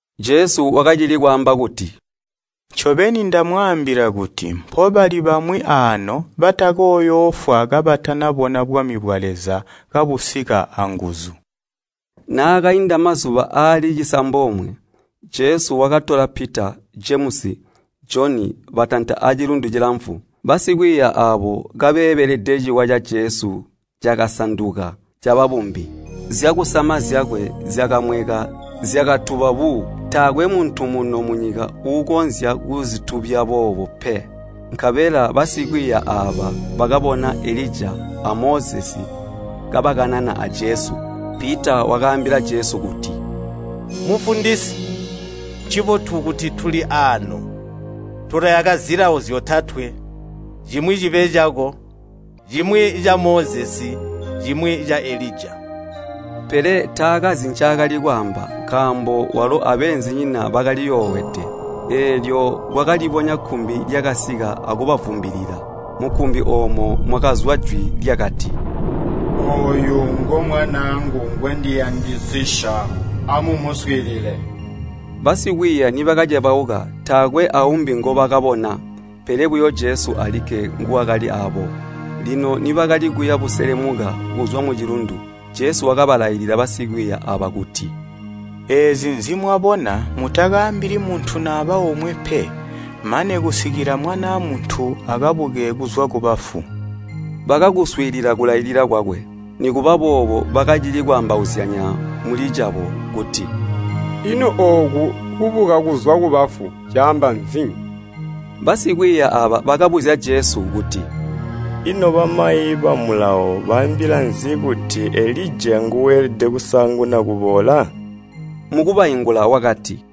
Jesu wakacili kwaamba kuti, “Ncombeni ndamwaambila kuti mpobali bamwi aano batakooyoofwa kabatanabona bwami bwa Leza kabusika anguzu.” Naakainda mazuba aali cisambomwe, Jesu wakatola Pita, Jemusi, Joni, batanta acilundu cilamfu. Basikwiiya aabo kabeebelede ciwa ca Jesu cakasanduka caba bumbi. Zyakusama zyakwe zyakamweka zyakatuba buu. Taakwe muntu muno munyika uukonzya kuzitubya boobu pe. Nkabela basikwiiya aaba bakabona Elija a Mozesi kabakanana a Jesu. Pita wakaambila Jesu kuti, “Mufundisi, ncibotu kuti tuli aano. Tulayaka zilawo zyotatwe, cimwi cibe cako, cimwi ca Mozesi, cimwi ca Elija.” Pele taakazi ncaakali kwaamba, nkaambo walo abeenzinyina bakaliyoowede. Eelyo kwakalibonya kkumbi lyakasika akubavumbilila. Mukkumbi oomo mwakazwa jwi lyakati, “Ooyu ngo Mwanaangu ngwendiyandisisya, amumuswiilile!” Basikwiiya nibakacebauka, taakwe aumbi ngobakabona, pele buyo Jesu alikke nguwakali aabo. Lino nibakali kuya buseleluka kuzwa mucilundu, Jesu wakalailila basikwiiya aaba kuti, “Eezi nzimwabona mutakaambili muntu naba omwe pe mane kusikila Mwanaa Muntu akabuke kuzwa kubafu.” Bakakuswiilila kulailila kwakwe, nikuba boobo bakacili kwaambauzyanya mulicabo kuti, “Ino ooku ‘Kubuka kuzwa kubafu’ caamba nzi?” Basikwiiya aaba bakabuzya Jesu, kuti, “Ino bamayi ba Mulawo baambila nzi kuti Elija nguuelede kusaanguna kuboola?” Mukubaingula wakati,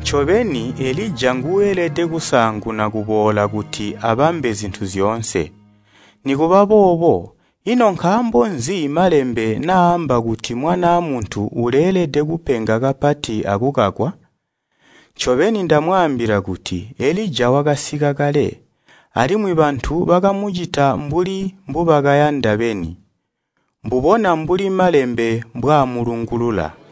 “Ncobeni Elija nguuelede kusaanguna kuboola kuti abambe zintu zyoonse. Nikuba boobo, ino nkaambo nzi Malembe naaamba kuti Mwanaa Muntu uleelede kupenga kapati akukakwa? Ncobeni ndamwaambila kuti Elija wakasika kale, alimwi bantu bakamucita mbuli mbubakayanda beni, mbubona mbuli Malembe mbwaamulungulula.”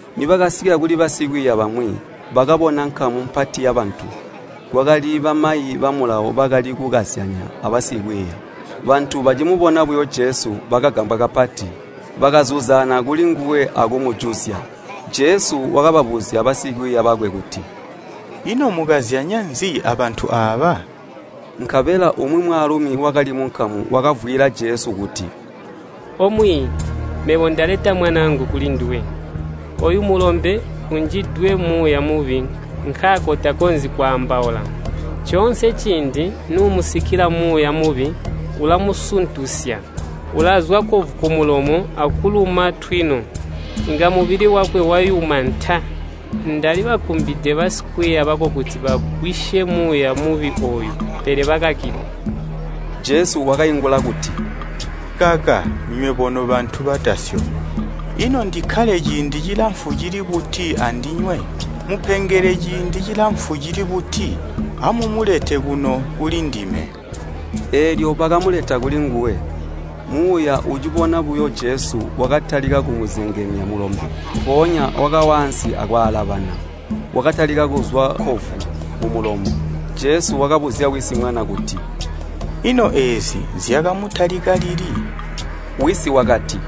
Nibakasika kuli basikwiiya bamwi, bakabona nkamu mpati yabantu, kwakali bamayi ba Mulawo bakali kukazyanya abasikwiiya. Bantu bacimubona buyo Jesu, bakagambwa kapati, bakazuzaana kulinguwe akumujuzya. Jesu wakababuzya basikwiiya bakwe kuti, “Ino mukazyanya nzi abantu aaba?” Nkabela umwi mwaalumi wakali munkamu wakavwiila Jesu kuti, “O Mwiiyi, mebo ndaleta mwanaangu kulinduwe. Ooyu mulombe unjidwe muuya mubi nkaako takonzyi kwaambaula. Coonse ciindi nuumusikila muuya mubi, ulamusuntusya, ulazwa kkovu kumulomo akuluma ntwino, inga mubili wakwe wayuma ntaa. Ndalibakumbide basikwiiya bako kuti bagwisye muuya mubi ooyu, pele bakakilwa.” Jesu wakaingula kuti, “Kaka nywebo nobantu batasyomi! Ino ndikkale ciindi cilamfu cili buti andinywe? Mmupengele ciindi cilamfu cili buti? Amumulete kuno kuli ndime!” Eelyo bakamuleta kulinguwe. Muuya ucibona buyo Jesu wakatalika kumuzengemya mulombe, mpoonya wakawa ansi akwaalabana, watalika kuzwa kkovu kumulomo. Jesu wakabuzya wisi mwana kuti, “Ino eezi zyakamutalika lili?” Wisi wakati,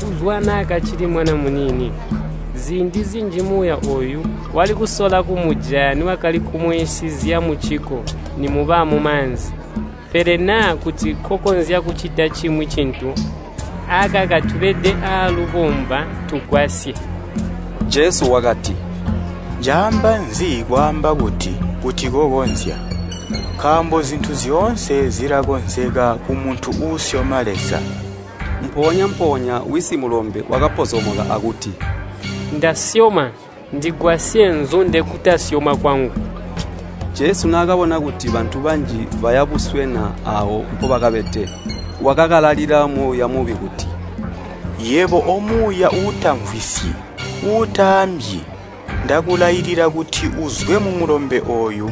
“Kuzwa naakacili mwana muniini. Ziindi zinji muuya ooyu wali kusola kumujaya niwakali kumuwisizya mucikko, nimuba mumaanzi. Pele naa kuti kokonzya kucita cimwi cintu, akaka tubede aalubomba, tugwasye!” Jesu wakati, “Caamba nzi kwaamba kuti, ‘Kuti kokonzya?’ Nkaambo zintu zyoonse zilakonzeka kumuntu uusyoma Leza.” Mpoonya-mpoonya wisi mulombe wakapozomoka akuti, “Ndasyoma, ndigwasye nnzunde kutasyoma kwangu!” Jesu naakabona kuti bantu banji baya buswena aawo mpobakabede, wakakalalila muuya mubi kuti, “Yebo omuuya uutamvwisyi, uutaambyi, ndakulailila kuti uzwe mumulombe ooyu,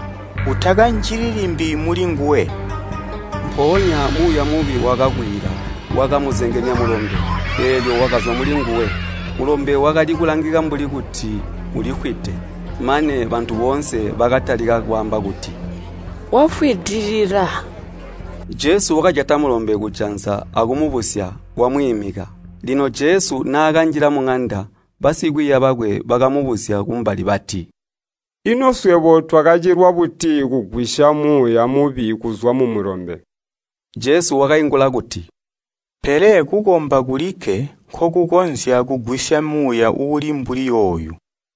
utakanjili limbi mulinguwe!” Mpoonya muuya mubi wakakwiila, wakamuzengemya mulombe, eelyo wakazwa mulinguwe. Mulombe wakali kulangika mbuli kuti ulifwide, mane bantu boonse bakatalika kwaamba kuti “Wafwidilila!” Jesu wakajata mulombe kujanza akumubusya, wamwiimika. Lino Jesu naakanjila muŋanda, basikwiiya bakwe bakamubuzya kumbali bati, “Ino swebo twakacilwa buti kugwisya muuya mubi kuzwa mumulombe?” Jesu wakaingula kuti, “Pele kukomba kulikke nkokukonzya kugwisya muuya uuli mbuli ooyu.”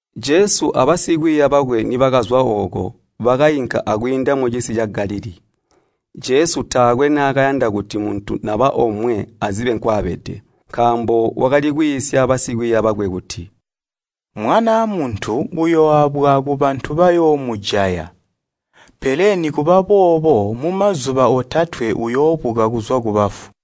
Jesu abasikwiiya bakwe nibakazwa ooko, bakainka akwiinda mucisi ca Galilii. Jesu taakwe naakayanda kuti muntu naba omwe azibe nkwaabede, nkaambo wakali kwiisya basikwiiya bakwe kuti, “Mwanaa Muntu uyooabwa kubantu bayoomujaya, pele nikuba boobo mumazuba otatwe uyoobuka kuzwa kubafu.”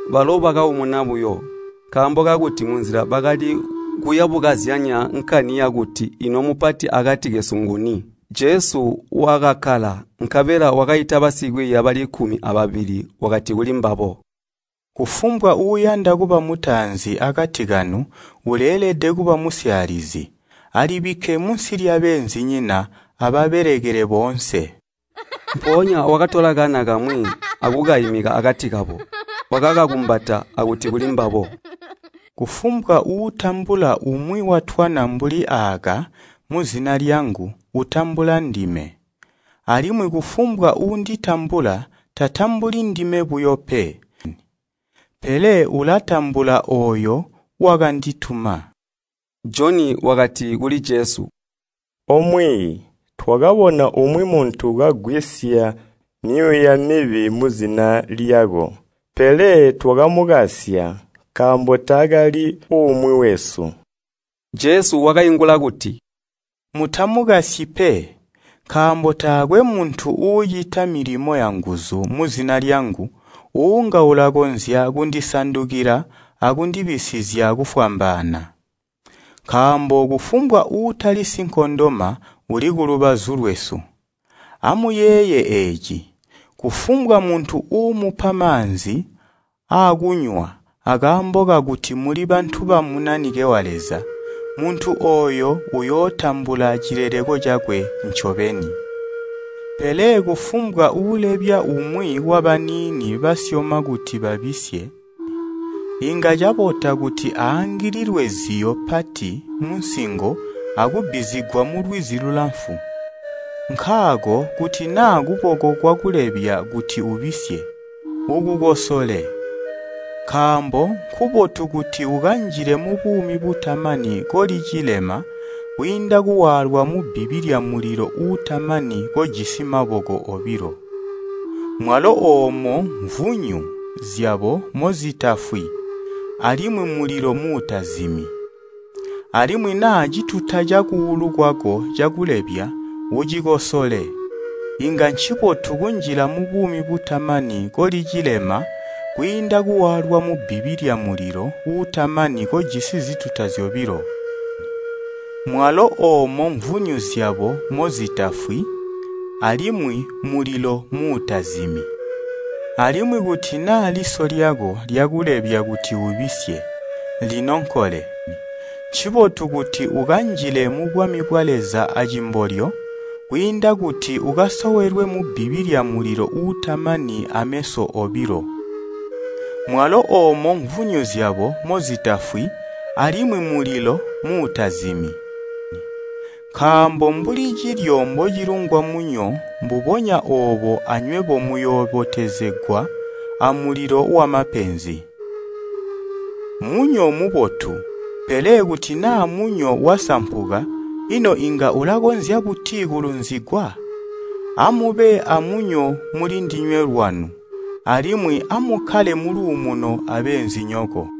Balo bakaumuna buyo, nkaambo kakuti munzila bakali kuyabukazyanya nkani yakuti ino mupati akati kesu nguni. Jesu wakakkala, nkabela wakaita basikwiiya bali kkumi ababili wakati kulimbabo, “Kufumbwa uuyanda kuba mutaanzi akati kanu uleelede kuba musyaalizi, alibikke munsi lyabeenzinyina, ababelekele boonse.” Mpoonya wakatola kana kamwi akukaimika akati kabo. Wakakakumbata akuti kulimbabo, “Kufumbwa uutambula umwi watwana mbuli aaka muzina lyangu utambula ndime, alimwi kufumbwa uunditambula, tatambuli ndime buyo pe, pele ulatambula ooyo wakandituma.” Joni wakati kuli Jesu, “O Mwiiyi, twakabona umwi muntu kagwisya myuuya mibi muzina lyako, pele twakamukasya, nkaambo taakali umwi wesu.” Jesu wakaingula kuti, “Mutamukasyi pe, nkaambo taakwe muntu uucita milimo yanguzu muzina lyangu uunga ulakonzya kundisandukila akundibisizya kufwambaana. Nkaambo kufumbwa uutali sinkondoma uli kulubazu lwesu. Amuyeeye eeci! Kufumbwa muntu uumupa maanzi aakunywa akaambo kakuti muli bantu ba Munanike wa Leza, muntu ooyo uyootambula cileleko cakwe ncobeni. “Pele kufumbwa uulebya umwi wabaniini basyoma kuti babisye, inga cabota kuti aangililwe ziyo pati munsingo akubbizigwa mulwizi lulamfu. Nkaako kuti naa kuboko kwakulebya kuti ubisye, ukukosole! Nkaambo nkubotu kuti ukanjile mubuumi butamani koli cilema kwiinda kuwaalwa mubbibi lyamulilo uutamani kojisi maboko obilo. Mwalo ‘Omo mvunyu zyabo mozitafwi, alimwi mulilo muutazimi.’] Alimwi naa cituta cakuulu kwako cakulebya, ucikosole. Inga ncibotu kunjila mubuumi butamani koli cilema kwiinda kuwaalwa mubbibi lyamulilo uutamani kojisi zituta zyobilo. [ Mwalo ‘Omo mvunyu zyabo mozitafwi, alimwi mulilo muutazimi.’] Alimwi kuti naa liso lyako lyakulebya kuti ubisye, linonkole. Ncibotu kuti ukanjile mubwami bwa Leza acimbolyo, kwiinda kuti ukasowelwe mubbibi lyamulilo uutamani ameso obilo. Mwalo ‘Omo mvunyu zyabo mozitafwi, alimwi mulilo muutazimi.’ “Nkaambo mbuli cilyo mbocilungwa munyo mbubonya oobo anywebo muyoobotezegwa amulilo wamapenzi! Munyo mubotu, pele kuti naa munyo wasampuka, ino inga ulakonzya buti kulunzigwa? Amube amunyo muli ndinywe lwanu, alimwi amukkale muluumuno abeenzinyoko.”